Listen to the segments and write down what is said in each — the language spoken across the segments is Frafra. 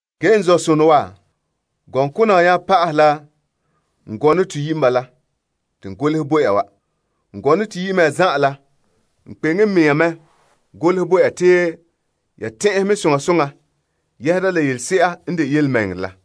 Ge n zɔ'sonɔ wa, gɔŋkona wa nya pa'ahɛ la n gɔnɔ toyi' n bala te n golehɛ bo ya wa. N gɔnɔ toyi' mea zan'an la, n kpeŋe n mɛŋa mɛ golehɛ bo ya te ya tɛn'ɛhɛ mɛ soŋa soŋa yɛhera la yelese'a n de yelemɛŋɛrɛ la.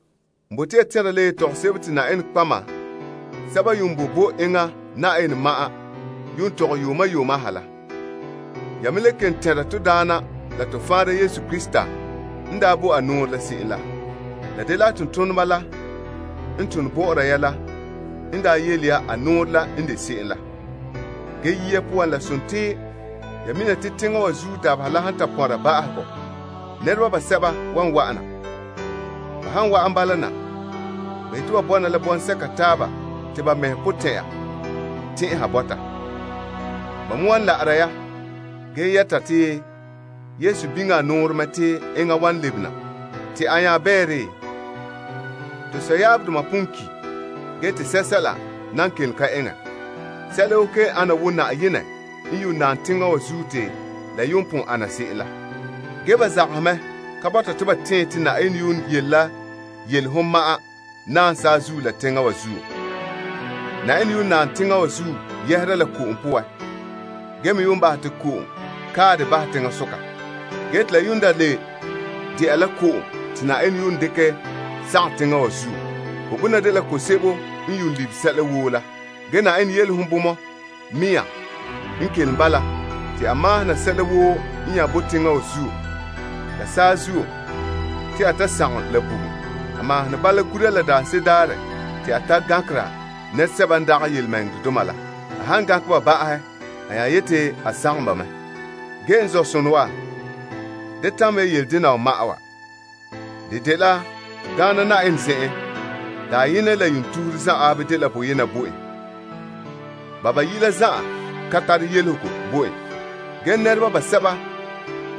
N bote ya tɛnra la yetɔgom sebo te Na'ayenɛ nɔtɔgɔheba sɛba n yuun boe bo enŋa Na'ayenɛ ma'an yuun tɔgɛ yuuma yuuma ha la. Ya me le kelom tɛnra to Daana la to Faanra Yesu Krista n daa bo a nɔɔrɛ la se'em la. La dela a tontoneba la n tone bɔ'ɔra ya la n daa yele ya a nɔɔrɛ la n de se'em la. Ge yia poan, la sontii ya mina te teŋa wa zuo dabeha la han ta pɔnra ba'ahegɔ, nɛreba basɛba wan wa'ana. Ba han wa'an bala na, ba yete ba bɔna la bɔŋsɛka taaba te ba mɛhe potɛn'ɛra tɛn'ɛha bɔta. Ba me wan la'ara ya, ge yɛta te, Yesu biŋe a nɔɔrɛ mɛ te enŋa wan lebe na? Te a nya bɛɛ? To sɔyaabdoma pon ki', ge te sɛla nan kelom ka eŋɛ. Sɛla woo kelom ana wo Na'ayenɛ n yuun naam teŋa wa zuo te la yuun pon ana se'em la. Ge ba zagahɛ mɛ ka bɔta ba te'ɛn te Na'ayenɛ yuun yele la yelehom ma'an naam saazuo la teŋa wa zuo. Na'ayenɛ yuun naam teŋa wa zuo yɛhera la ko'om poan ge me yuun bahɛ te ko'om kae dɛ bahɛ teŋasoka. Gee te la yuun da le dela ko'om te Na'ayenɛ yuun dekɛ sagom teŋa wa zuo. Ko'bona dela ko'om sebo n yuun libe sɛla woo la. Ge Na'ayenɛ yelehom bomɔ mea n kelom bala te a maahom na sɛla woo nya boe teŋa wa zuo la saazuo te a ta sagom la bugum. A maahom ne bala gura la daanse'ere daarɛ te a ta gankera nɛresɛba n ka zote Yenɛ la. A han gankɛ ba ba'ahɛ a nya yete a sagom ba mɛ. Ge n zɔ'sonɔ wa, da tamɛ ya yele dena wa ma'an wa. De dela to Daana Na'ayenɛ zen'en, dayenɛ la yuun tuhure zan'an dela boyena bo en. Ba bayi' la zan'an ka tare yelehego bo en. Ge nɛreba basɛba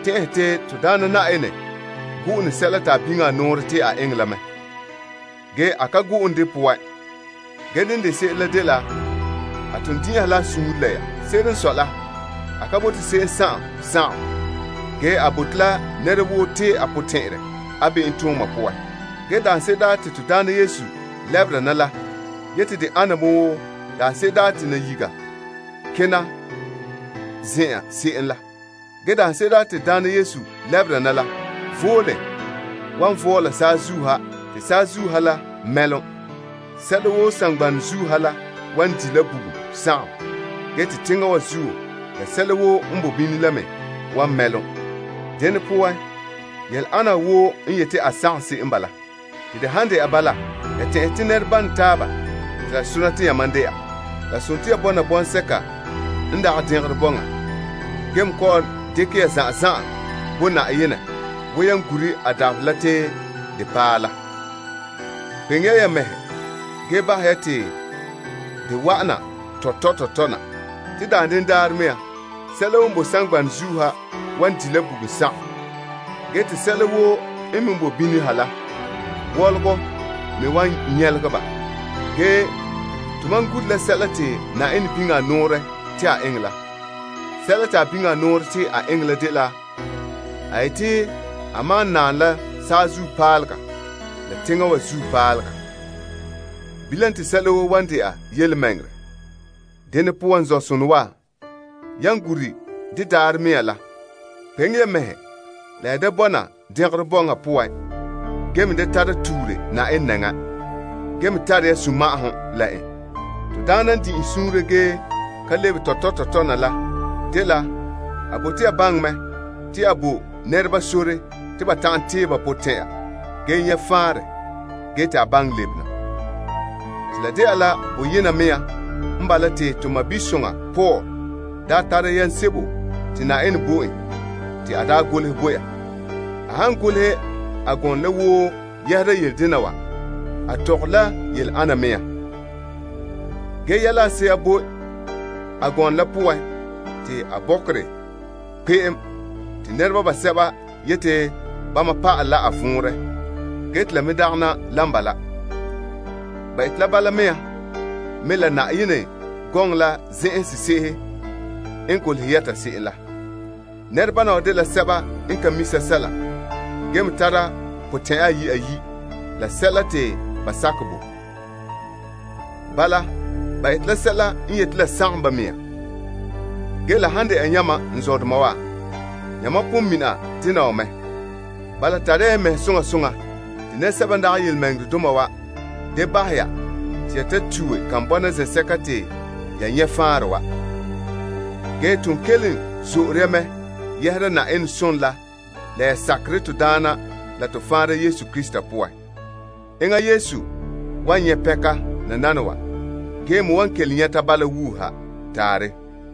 tɛn'ɛhɛ te to Daana Na'ayenɛ gu'une sɛla te a biŋe a nɔɔrɛ te a eŋɛ la mɛ. Ge a ka gu'une de poan. Ge dene de se'ere dela a ton din'inha la suunre la ya. Se'ere n sɔe la, a ka bote se'em sagom. Ge a bote la nɛra woo tee a potɛn'ɛrɛ a be'emtooma poan. Ge daanse'ere daarɛ te to Daana Yesu lɛbera na la yete de ana me wo nayiga kena la. Ge de daarɛ vole wan vɔɔla saazuo ha te saazuo ha la mɛlom. Sɛla woo saŋgbanɛ zuo ha la wan di' la bugum sagom, ge te teŋa wa zuo la sɛla woo n boe bini la me wan mɛlom. Dene poan yele ana wa woo n yete a sagom se'em n bala. Te de han de'a bala, ya tɛn'ɛhe te nɛrebama taaba te la sona te yamam dɛna? Ya bɔna, ya vɔna toolom vom, ge kaanbe ya mɛhe bo Yenɛ. Wo yan gure Yenɛ dabaherɛ kpeŋe ya ya mɛhe ge bahɛ te de wa'an kalam kalam na. Te daanden daarɛ mea, sɛla woo n boe saŋgbanɛ zuo ha wan di' la bugum sagom ge te sɛla woo n me boe bini ha la, wɔlɔgɔ me wan nyɛlegɛ ba. Ge to mam gure la sɛla te Na'ayenɛ biŋe a nɔɔrɛ te a eŋɛ la. Sɛla te a biŋe a nɔɔrɛ te a eŋɛ la dela a yete a maan naam la saazuo paalega la teŋa wa zuo paalega. Bilam te tontɔɔ bɔŋa wan bɔna. Dene poan, n zɔ'sonɔ wa, yan gure de daarɛ mea la, kpeŋe ya mɛhe la ya da bɔna dɛngerɔ bɔŋa poan ge me da tara tuure Na'ayenɛ nɛŋa, ge me tara ya sunma'ahom la en. To Daana n din'inhe suunre ge ka lebe tɔtɔ tɔtɔ na la dela a bote ya baŋɛ mɛ te a bo nɛreba sore te ba ta'an tee ba potɛn'ɛra ge nyɛ' faanrɛ gee te a baŋɛ lebe na. Te la de'a la boyena mea n bala, te to sɔɔnsoŋa Paul daa tara yam sebo te Na'ayenɛ bo en te a daa golehɛ bo ya. A han ta goleha a gɔnɔ la woo yɛhera yele dena wa, a tɔgɔre la yele ana me. Ge yɛla a se'a boe a gɔnɔ la poan te a bɔkerɛ kpeem te nɛreba basɛba yete bama pa'ale la a vɔnrɛ, ge te la me dagana lan bala. Ba ete la Yenɛ gɔŋɔ la zen'en sese'ehe n gee la bala mea. Nɛrebana wa dela sɛba n ka mi' sɛla ge me tara potɛn'ɛra ayi' ayi' la sɛla te ba sakɛ bo. Bala, ba ete la sɛla n yete la sagom ba mɛŋa. Ge la han dɛna yamam n zɔdoma wa, yamam pon mina dena wa mɛ. Bala, tare ya ya mɛhe soŋa soŋa te nɛresɛba n dagɛ yelemɛŋɛrɛdoma wa da bahɛ ya te ya tue kan bɔna zen'sɛka te ya nyɛ' faanra wa. Ge ton kelom zo'ore ya mɛ yɛhera Na'ayenɛ zo'ohogɔ la a mi'ilom la poan, la ya sakerɛ to Daana la to Faanra Yesu Krista poan. Enŋa Yesu wan nyɛ' pɛnka nananawa ge me wan kelom nyɛta bala wuuha. Taarɛ.